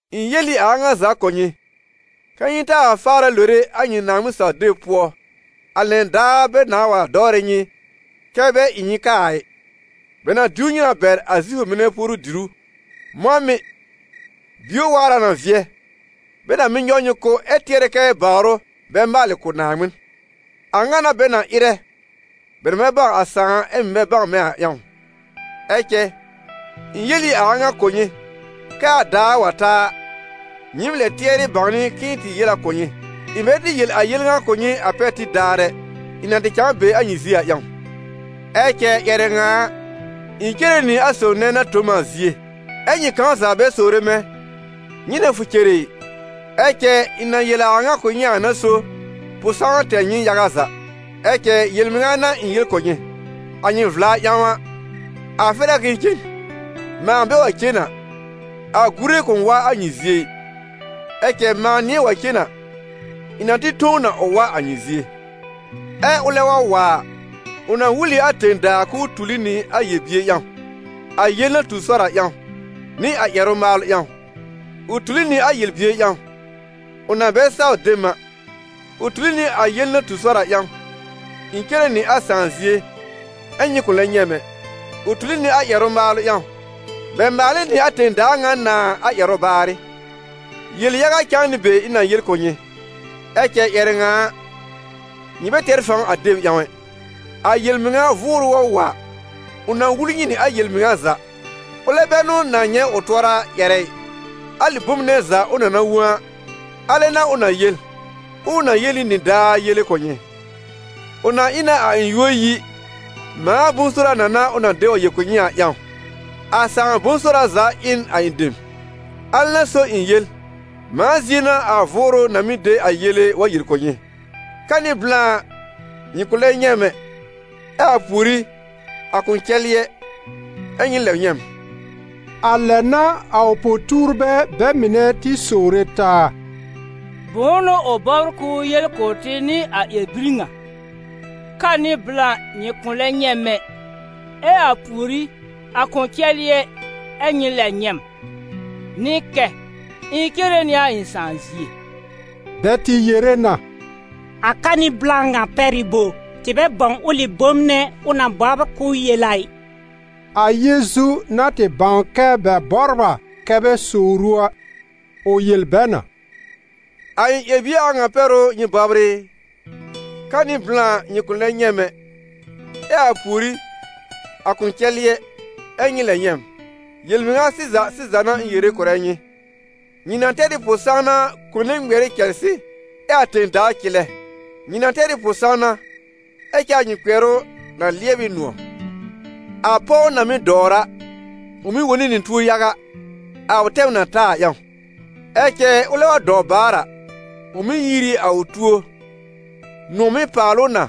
«Ɩ̃ yel ɩ a a ŋa za kʋ̀ nyɩ kɛ́ nyɩ taa faarɛ lore a nyɩ Naaŋmɩn-saw-deb pʋɔ, a lɛn daar bɛ nãá wa dɔwrɛ nyɩ kɛ́ bɛ ɩ nyɩ kaa a ɩ. Bɛ na diw nyɩ na bɛr a Zifʋ mɩnɛ puoru-dìrú. Mɔ̃ mɩ̀, bio waar a na vɩɛ, bɛ na mɩ́ nyɔw nyɩ kʋ́ ɛ tɩɛrɛ kɛ bawr ʋ bɛ maalɩ kʋ̀ Naaŋmɩn. A ŋa n'a bɛ na ɩrɛ, bɛ na bɛ bãw a Sãà ɛ mɩ̀ bɛ bãw mɛ̃ a ƴãw. Ɛ cɛ ɩ̃ yel ɩ a a ŋa kʋ̀ nyɩ, kɛ a daar wa ta a, nyɩɩm lɛ tɩɛrɩ bãwnɩ k'ɩ̃ɩ tɩ yel a na kʋ̀ nyɩ.» « Ɩ̃ bɛ tɩ yel a yel ŋa kʋ̀ nyɩ a pɛr tib daar ɛ, ɩ̃ na tɩ cãa be a nyɩ zie a ƴãw. Ɛ cɛ ƴɛrɛ ŋa a, ɩ̃ cere nɩ a sob nɛ na tõ m a zie, ɛ́ nyɩ kãw za bɛ sowre mɛ̃: ‹Nyɩnɛ fʋ cere ɩ?› Ɛ cɛ ɩ̃ na yel a a ŋa kʋ̀ nyɩ a n'a so pʋ-sãwna tɛr nyɩ yaga za. Ɛ cɛ yel-mɩŋa n'a ɩ̃ yel kʋ̀ nyɩ: a nyɩ vla ƴãw a, a fɛr a k'ɩ̃ɩ cen; mãa bɛ wa cen a, a Gure kʋ̃ wa a nyɩ zie ɩ; ɛ cɛ mãa nɩ̃ɛ wa cen a, ɩ̃ na tɩ tõ ʋ na ʋ wa a nyɩ zie. Ɛ ʋlɛ wa wa a, ʋ na wul ɩ a tẽ-daa k'ʋʋ tuli nɩ a yel-bier ƴãw, a yel na tu sɔr a ƴãw, nɩ a ƴɛrʋ-maalʋ ƴãw. Ʋ tuli nɩ a yel-bier ƴãw, ʋ na bɛ saw de m a; ʋ tuli nɩ a yel na tu sɔr a ƴãw: ɩ̃ cere nɩ a Sãà zie ɛ́ nyɩ kʋ̃ lɛb nyɛ̃ m ɛ; ʋ tuli nɩ a ƴɛrʋ-maalʋ ƴãw: bɛ maal ɩ nɩ a tẽ-daa ŋa nãá a ƴɛrʋ baarɩ.» «Yel-yaga cãa nɩ be ɩ̃ na yel kʋ̀ nyɩ, ɛ cɛ ƴɛrɛ ŋa a, nyɩ bɛ tɛr fãw a deb ƴãw ɛ. A yel-mɩŋa Vʋʋrʋ wa wa a, ʋ na wul nyɩ nɩ a yel-mɩŋa za. Ʋlɛ bɛ n'ʋ na nyɛ̃ ʋ tʋɔra ƴɛrɛ ɩ, alɩ bom nɛ za ʋ na na wõ a, alɛ n'a ʋ na yel, ɛ ʋ na yel ɩ nɩdaar yele kʋ̀ nyɩ. Ʋ na ɩ na a ɩ̃ yúor yi, mãa bʋ̃-sora na n'a ʋ na de wa yel kʋ̀ nyɩ a ƴãw. A Sãà bʋ̃-sora za ɩ n a ɩ̃ dem, alɛ n'a so ɩ̃ yel: ‹Mãa zie n'a a Vʋʋrʋ na mɩ́ de a yele wa yel kʋ̀ nyɩ.›» «Ka nɩ blã nyɩ kʋ̃ lɛb nyɛ̃ m ɛ, ɛ a pùorí, a kʋ̃ cɛlɩ ɛ, ɛ́ nyɩ lɛb nyɛ̃ m.» A lɛ n'a a ʋ po-tuurbɛ bɛ mɩnɛ tɩ sowre taa: «Bʋ̃ʋ n'ʋ ʋ bɔbr k'ʋʋ yel kʋ̀ tɩ nɩ a ƴɛr-bir ŋa: ‹Ka nɩ blã nyɩ kʋ̃ lɛb nyɛ̃ m ɛ, ɛ a pùorí, a kʋ̃ cɛlɩ ɛ, ɛ nyɩ lɛb nyɛ̃ m›? Nɩ kɛ: ‹Ɩ̃ cere nɩ a Sãà zie.›» Bɛ tɩ yere na: « ‹A ka nɩ blã ŋa› pɛr ɩ bo? Tɩ bɛ bãw ʋlɩ bom nɛ ʋ na bɔbr k'ʋʋ yel a ɩ!» A Yeezu na tɩ bãw kɛ bɛ bɔbr a kɛ bɛ sowr ʋ a, ʋ yel bɛ na: «A ɩ̃ ƴɛr-bie a ŋa pɛr ʋ nyɩ bɔbr ɩ? ‹Ka nɩ blã nyɩ kʋ̃ lɛ nyɛ̃ m ɛ, ɛ a pùorí, a kʋ̃ cɛlɩ ɛ, ɛ nyɩ lɛb nyɛ̃ m.› Yel-mɩŋa sɩza sɩza n'a ɩ̃ yere kʋ̀rɛ nyɩ, nyɩ na tɛr ɩ pʋ-sãwna kone ŋmɩɛr ɩ cɛlsɩ ɛ a tẽ-daa cɩlɛ; nyɩ na tɛr ɩ pʋ-sãwna, ɛ cɛ a nyɩ kpɩɛrʋ na lɩɛb ɩ nʋ̃ɔ̀. A pɔw na mɩ́ dɔwr a, ʋ mɩ́ wone nɩ tuo yaga, a ʋ tɛm na ta a ƴãw; ɛ cɛ ʋlɛ wa dɔw baar a, ʋ mɩ́ yiir ɩ a ʋ tuo, nʋ̃ɔ̀ mɩ́ paal ʋ na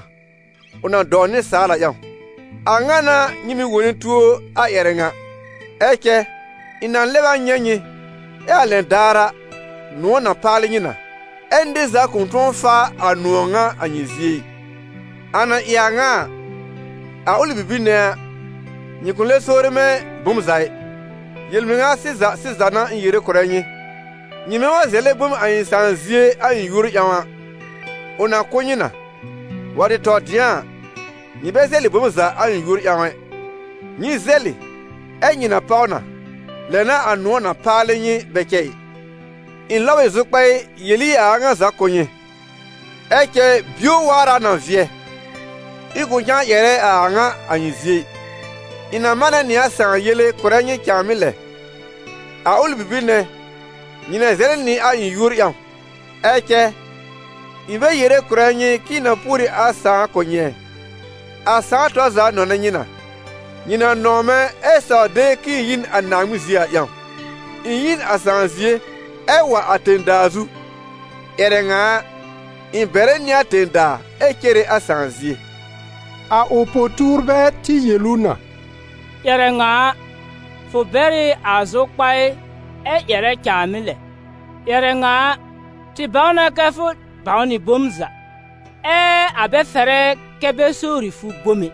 ʋ na dɔw nɩsaal a ƴãw. A ŋa n'a nyɩ mɩ̀ wone tuo a ƴɛrɛ ŋa; ɛ cɛ ɩ̃ na lɛb a nyɛ̃ nyɩ, ɛ a lɛn daar a, nʋ̃ɔ̀ na paalɩ nyɩ na, ɛ́ nɩr za kʋ̃ tʋ̃ɔ faa a nʋ̃ɔ̀ ŋa a nyɩ zie ɩ.» «A na ɩ a ŋa a, a ʋlɩ bibir nɛ a, nyɩ kʋ̃ lɛb sowre mɛ̃ bom za ɩ. Yel-mɩŋa sɩza sɩza n'a ɩ̃ yere kʋ̀rɛ nyɩ, nyɩmɛ wa zɛlɛ bom a ɩ̃ Sãà zie a ɩ̃ yúor ƴãw a, ʋ na kʋ̀ nyɩ na. Wa tɩ tɔ dɩ̃a a, nyɩ bɛ zɛlɩ bom za a ɩ̃ yúor ƴãw ɛ: nyɩ zɛlɩ ɛ nyɩ na páw na, lɛ n'a a nʋ̃ɔ̀ na paalɩ nyɩ bɛ cɛ ɩ.» «Ɩ̃ lɔb ɩ zʋkpaɩ yel ɩ a a ŋa za kʋ̀ nyɩ. Ɛ cɛ bio waar a na vɩɛ, ɩ̃ kʋ̃ cãa ƴɛrɛ a a ŋa a nyɩ zie ɩ, ɩ̃ na manɛ nɩ a Sãà yele kʋ̀rɛ nyɩ cãàmɩ́ lɛ. A ʋlɩ bibir nɛ, nyɩ na zɛlɛ nɩ a ɩ̃ yúor ƴãw. Ɛ cɛ ɩ̃ bɛ yere kʋ̀rɛ nyɩ k'ɩ̃ɩ na pùor ɩ a Sãà kʋ̀ nyɩ ɛ, a Sãà tɔr za nɔnɛ nyɩ na, nyɩ na nɔ̃w mɛ̃ ɛ saw de k'ɩ̃ɩ yi n a Naaŋmɩn zie a ƴãw. Ɩ̃ yi n a Sãà zie ɛ wa a tẽ-daa zu; ƴɛrɛ ŋa a, ɩ̃ bɛrɛ nɩ a tẽ-daa ɛ cere a Sãà zie.» A ʋ po-tuurbɛ tɩ yel ʋ na: «Ƴɛrɛ ŋa a, fʋ bɛr ɩ a zʋkpaɩ ɛ ƴɛrɛ cãàmɩ́ lɛ; ƴɛrɛ ŋa a, tɩ bãw na kɛ fʋ bãw nɩ bom za, ɛ a bɛ fɛrɛ kɛ bɛ sowri fʋ bom ɛ.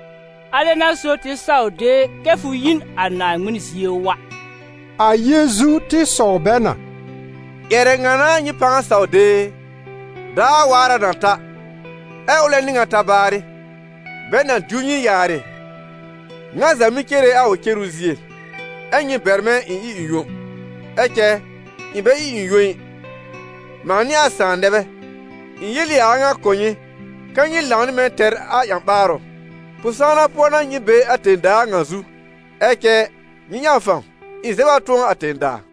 Alɛ n'a so tɩ saw de kɛ fʋ yi n a Naaŋmɩn zie wa.» A Yeezu tɩ sɔw bɛ na: «Ƴɛrɛ ŋa n'a nyɩ pãa saw de e? Daar waar a na ta, ɛ ʋlɛ n'ɩ ŋa ta baarɩ, bɛ na diw nyɩ yaarɩ, ŋa za mɩ́ cere a ʋ cenu zie, ɛ́ nyɩ bɛr mɛ̃ ɩ̃ ɩ ɩ̃ yõ. Ɛ cɛ ɩ̃ bɛ ɩ ɩ̃ yõ ɩ, mãa nɩ a Sãà nɛ bɛ. Ɩ̃ yel ɩ a a ŋa kʋ̀ nyɩ kɛ́ nyɩ lãw nɩ mɛ̃ tɛr a ƴã-ɓaarʋ. Pʋ-sãwna pʋɔ n'a nyɩ be a tẽ-daa ŋa zu, ɛ cɛ nyɩ ƴãw fãw, ɩ̃ zɛb a tʋ̃ɔ a tẽ-daa.»